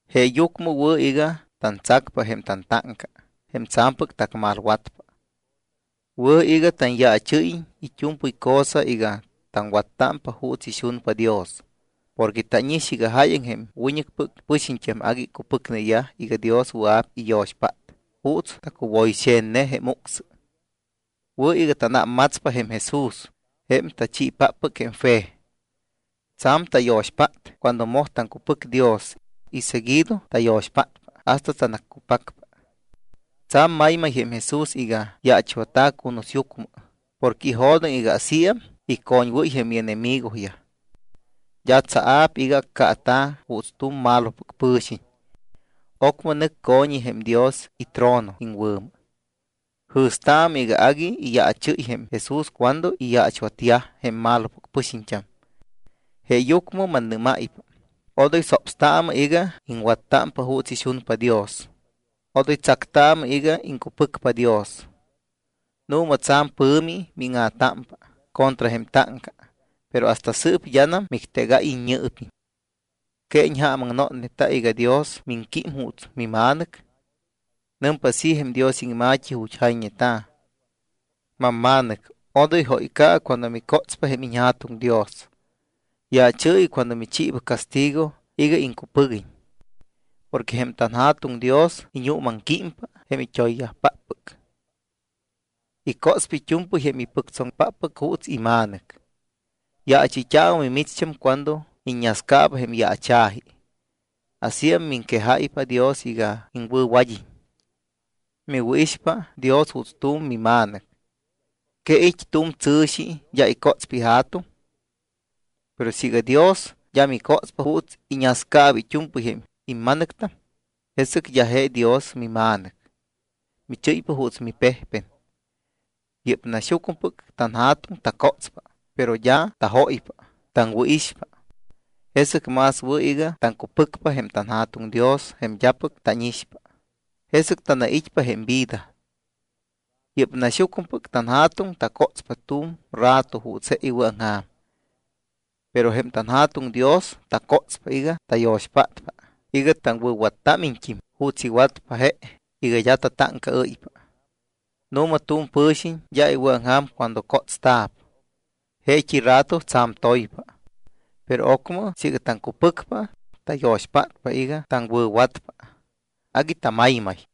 Jeeyucmɨ wɨ̱ iga tantsacpa jém tantáŋca jém tsa̱mpɨc tacmalwatpa. Wɨ̱ iga tanyaachɨ́yiñ it́u̱mpɨy cosa iga taŋwattámpa juuts ixunpa Dios porque tánix iga jáyaŋ jém wiñɨcpɨc pɨxiñt́am agui icupɨcneyaj iga Dios wɨa̱p iyo̱xpát juuts tacuwo̱yxe̱tne jém ucsɨ. Wɨ̱ iga tánámmatspa jém Jesús jém tachiipáppɨc jém fe. Tsa̱m tayo̱xpát cuando moj taŋcupɨc Dios y seguido tayo̱xpátpa hasta tanaccupacpa. Tsa̱m maymay jém Jesús iga yaachwatta̱ cunusyucmɨ porque ijo̱doŋ iga asíam icoñwɨ́ypa jém ienemigoyaj. D́a tsaa̱p iga accaata̱ juuts tu̱m malopɨc pɨ̱xiñ. Ocmɨ nɨc co̱ñi jém Dios itrono iŋwɨ̱mɨ. Jɨ̱staamɨ iga agui iyaachɨ́y jém Jesús cuando iyaachwatyaj jém malopɨc pɨxiñt́am. Jeeyucmɨ mannɨ́máypa: Odoy sopstaamɨ iga iŋwattámpa juuts ixunpa Dios, odoy tsactaamɨ iga iŋcupɨcpa Dios. Nu̱ma tsa̱m pɨ̱mi míŋa̱támpa contra jém táŋca, pero hasta sɨɨp d́anam mictegáy iññɨɨpiñ. ¿Que iñjaamaŋnotneta iga Dios miŋquím juuts mima̱nɨc? Nɨmpa así jém Dios iŋma̱t́i ju̱t́ jayñeta̱: Mamma̱nɨc, odoy jóyca̱ɨ cuando micótspa jém iñJa̱tuŋ Dios. Yaachɨɨyɨ cuando michiiba castigo iga iŋcupɨguiñ. Porque jém tanJa̱tuŋ Dios iñuumaŋquímpa jém it́oyyajpáppɨc. Icótspa it́u̱mpɨy jém ipɨctsoŋpáppɨc juuts ima̱nɨc. Yaachɨyt́aamɨ mimicht́am cuando iññascaaba jém yaacha̱ji. Asíam miŋquejáypa Dios iga iŋwɨ̱wad́iñ. Miwɨ̱ixpa Dios juuts tu̱m mima̱nɨc. ¿Que it́ tu̱m tsɨ̱xi d́a icótspa ija̱tuŋ? Pero siiga Dios d́a micótspa juuts iñascaaba it́u̱mpɨy jém ima̱nɨctam, jesɨc d́a je Dios mima̱nɨc. Michɨ́ypa juuts mipejpen. Yɨ́p naxyucmɨpɨc tanja̱tuŋ tacótspa, pero d́a tajóypa, taŋwɨ̱ixpa. Jesɨc más wɨ̱ iga taŋcupɨcpa jém anJa̱tuŋ Dios jém d́apɨc tánixpa, jesɨc tanait́pa jém vida. Yɨ́p naxyucmɨpɨc tanja̱tuŋ tacótspa tu̱m rato juuts je iwɨ̱aŋja̱m. Pero jém tanJa̱tuŋ Dios tacótspa iga tayo̱xpátpa iga taŋwɨ̱wattámiñt́im juuts iwatpa je iga d́a tatáŋcaɨ́ypa. Nu̱ma tu̱m pɨ̱xiñ d́a iwɨ̱aŋja̱m cuando cótsta̱p. Jeet́i rato tsa̱m toypa. Pero ocmɨ siiga taŋcupɨcpa, tayo̱xpátpa iga taŋwɨ̱watpa, agui tamaymay.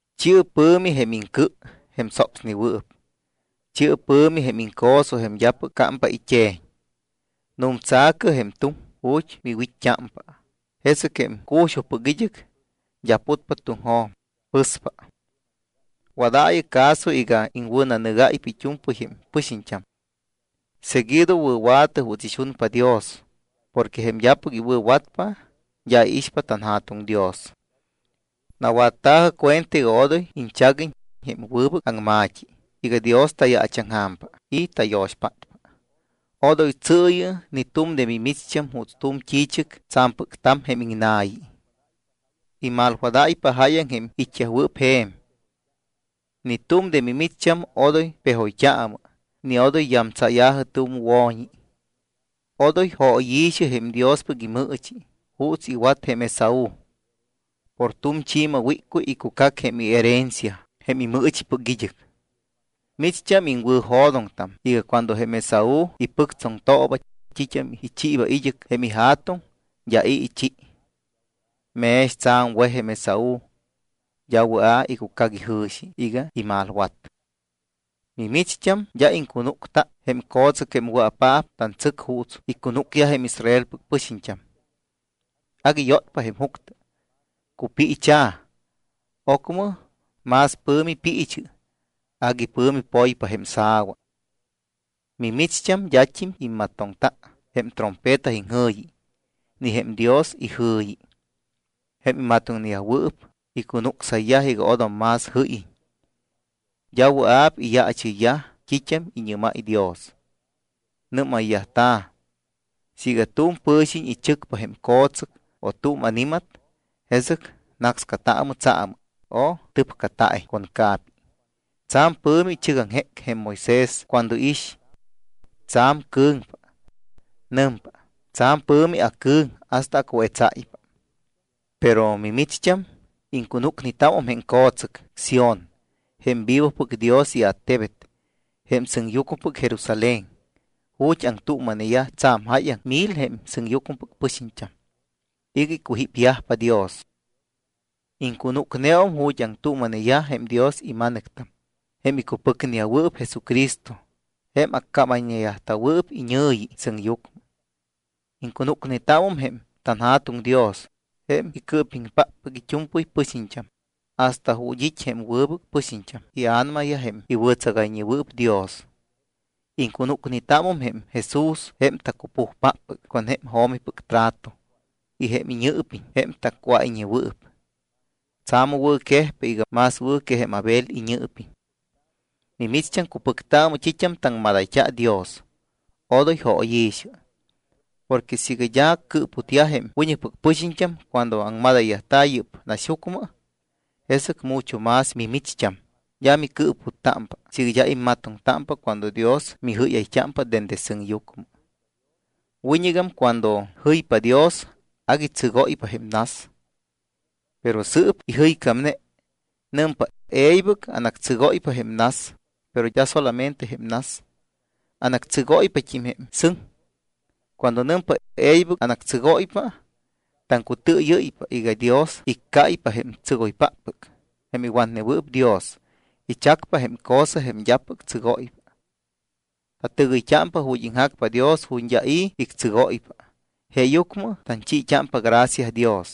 Chi̱ɨ pɨ̱mi jém iŋcɨ jém sopsnewɨɨp. Chi̱ɨ pɨ̱mi jém iŋco̱so jém d́apɨc cámpa it́e̱ñ. Nu̱mtsa̱cɨ jém tuŋ ju̱t́ miwit́t́ámpa, jesɨc jém cu̱xujpɨc id́ɨc d́a putpa tuŋjo̱m, pɨspa. Wadaayɨ caso iga iŋwɨ̱nanɨgáypa it́u̱mpɨy jém pɨxiñt́am. Seguido wɨ̱wa̱tɨ juuts ixunpa Dios porque jém d́apɨc iwɨ̱watpa d́a iixpa tanJa̱tuŋ Dios. Nawatta̱jɨ cuenta iga odoy iñchaguiñ jém wɨbɨc aŋma̱t́i iga Dios tayaachaŋja̱mpa y tayo̱xpátpa. Odoy tsɨɨyɨ ni tu̱m de mimicht́am juuts tu̱m t́i̱chɨc tsa̱mpɨc ta̱m jém iŋna̱yi. Imalwadáypa jáyaŋ jém it́yajwɨɨp je̱m. Ni tu̱m de mimicht́am odoy pejoyt́aamɨ ni odoy yamtsaaya̱jɨ tu̱m wo̱ñi. Odoy jóyi̱xɨ jém Diospɨc imɨɨchi juuts iwat jém Esaú. Por tu̱m chi̱ma wíccuy icucac jém herencia jém imɨɨchipɨc id́ɨc. Micht́am iŋwɨ̱jo̱doŋtam iga cuando jém Esaú ipɨctsoŋtooba t́it́am ichiiba id́ɨc jém ija̱tuŋ, d́a i̱ ichi. Mex tsa̱m wej jém Esaú, d́am wɨa̱ icucac ijɨ̱xi iga imalwat. Mimicht́am d́a iŋcunúcta jém co̱tsɨc jém wɨa̱paap tantsɨc juuts icunúcyaj jém Israelpɨc pɨxiñt́am. Agui yótpa jém juctɨ, cupiicha̱. Ocmɨ más pɨ̱mi piichɨ, agui pɨ̱mi poypa jém sa̱wa. Mimicht́am d́at́im immatoŋta jém trompeta iŋjɨ̱yi ni jém Dios ijɨ̱yi. Jém imatoŋyajwɨɨp icunucsayyaj iga odom más jɨ́yiñ. D́a wɨa̱p iyaachɨyyaj t́it́am iñɨ́máy Dios. Nɨ́mayyajta̱: “Siiga tu̱m pɨ̱xiñ ichɨcpa jém co̱tsɨc o tu̱m ani̱mat, jesɨc nácscataamɨ tsaamɨ o tɨpcata̱iñ con ca̱pi.” Tsa̱m pɨ̱mi ichɨgaŋjéc jém Moisés cuando iix. Tsa̱m cɨ̱ŋpa. Nɨmpa: “Tsa̱m pɨ̱mi acɨ̱ŋ hasta acuetsáypa.” Pero, mimicht́am, iŋcunúcnetámum jém co̱tsɨc Sión, jém vivopɨc Dios iattebet, jém sɨŋyucmɨpɨc Jerusalén, ju̱t́ aŋtuuma̱neyaj tsa̱m jáyaŋ mil jém sɨŋyucmɨpɨc pɨxiñt́am iga icujípyajpa Dios. Iŋcunúcneum ju̱t́ aŋtuuma̱neyaj jém Dios ima̱nɨctam jém icupɨcneyajwɨɨp Jesucristo jém accámayñeyajta̱wɨɨp iñɨ̱yi sɨŋyucmɨ. Iŋcunúcnetámum jém tanJa̱tuŋ Dios, jém icɨɨpiŋpáppɨc it́u̱mpɨy pɨxiñt́am, y hasta ju̱t́ it́ jém wɨbɨc pɨxiñt́am ia̱namayaj jém iwɨ̱tsagayñeyajwɨɨp Dios. Iŋcunúcnetámum jém Jesús jém tacupujpáppɨc con jém jo̱mipɨc trato, y jém iñɨɨpiñ jém tacuáyñewɨɨp. Tsa̱m wɨ̱ quejpa iga más wɨ̱ que jém Abel iñɨɨpiñ. Mimicht́am, cupɨctaamɨ t́it́am taŋmadayt́a Dios, odoy jóyi̱xɨ. Porque siiga d́a cɨɨputyaj jém wiñɨcpɨc pɨxiñt́am cuando aŋmadayyajta̱ yɨ́p naxyucmɨ, jesɨc mucho más mimicht́am d́a micɨɨputtámpa siiga d́a immatoŋtámpa cuando Dios mijɨ́yayt́ámpa dende sɨŋyucmɨ. Wiñɨgam cuando jɨypa Dios, agui tsɨgóypa jém nas. Pero sɨɨp ijɨycámne, nɨmpa: “E̱ybɨc anactsɨgóypa jém nas, pero d́a solamente jém nas, anactsɨgóypat́im jém sɨŋ.” Cuando nɨmpa: “E̱ybɨc anactsɨgóypa”, taŋcutɨɨyɨ́ypa iga Dios iccáypa jém tsɨgoypáppɨc, jém iwatnewɨɨp Dios, ichacpa jém cosa jém d́apɨc tsɨgóypa. Tatɨgɨyt́ámpa ju̱t́ iŋjacpa Dios ju̱t́ d́a i̱ ictsɨgóypa, jeeyucmɨ tanchiit́ámpa gracia Dios.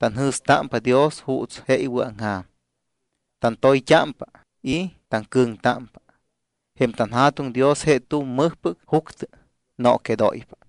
Tanjɨ̱stámpa Dios juuts je iwɨ̱aŋja̱m. Tantoyt́ámpa y taŋcɨ̱ŋtámpa. Jém tanJa̱tuŋ Dios je tu̱m mɨjpɨc juctɨ, nooquedóypa.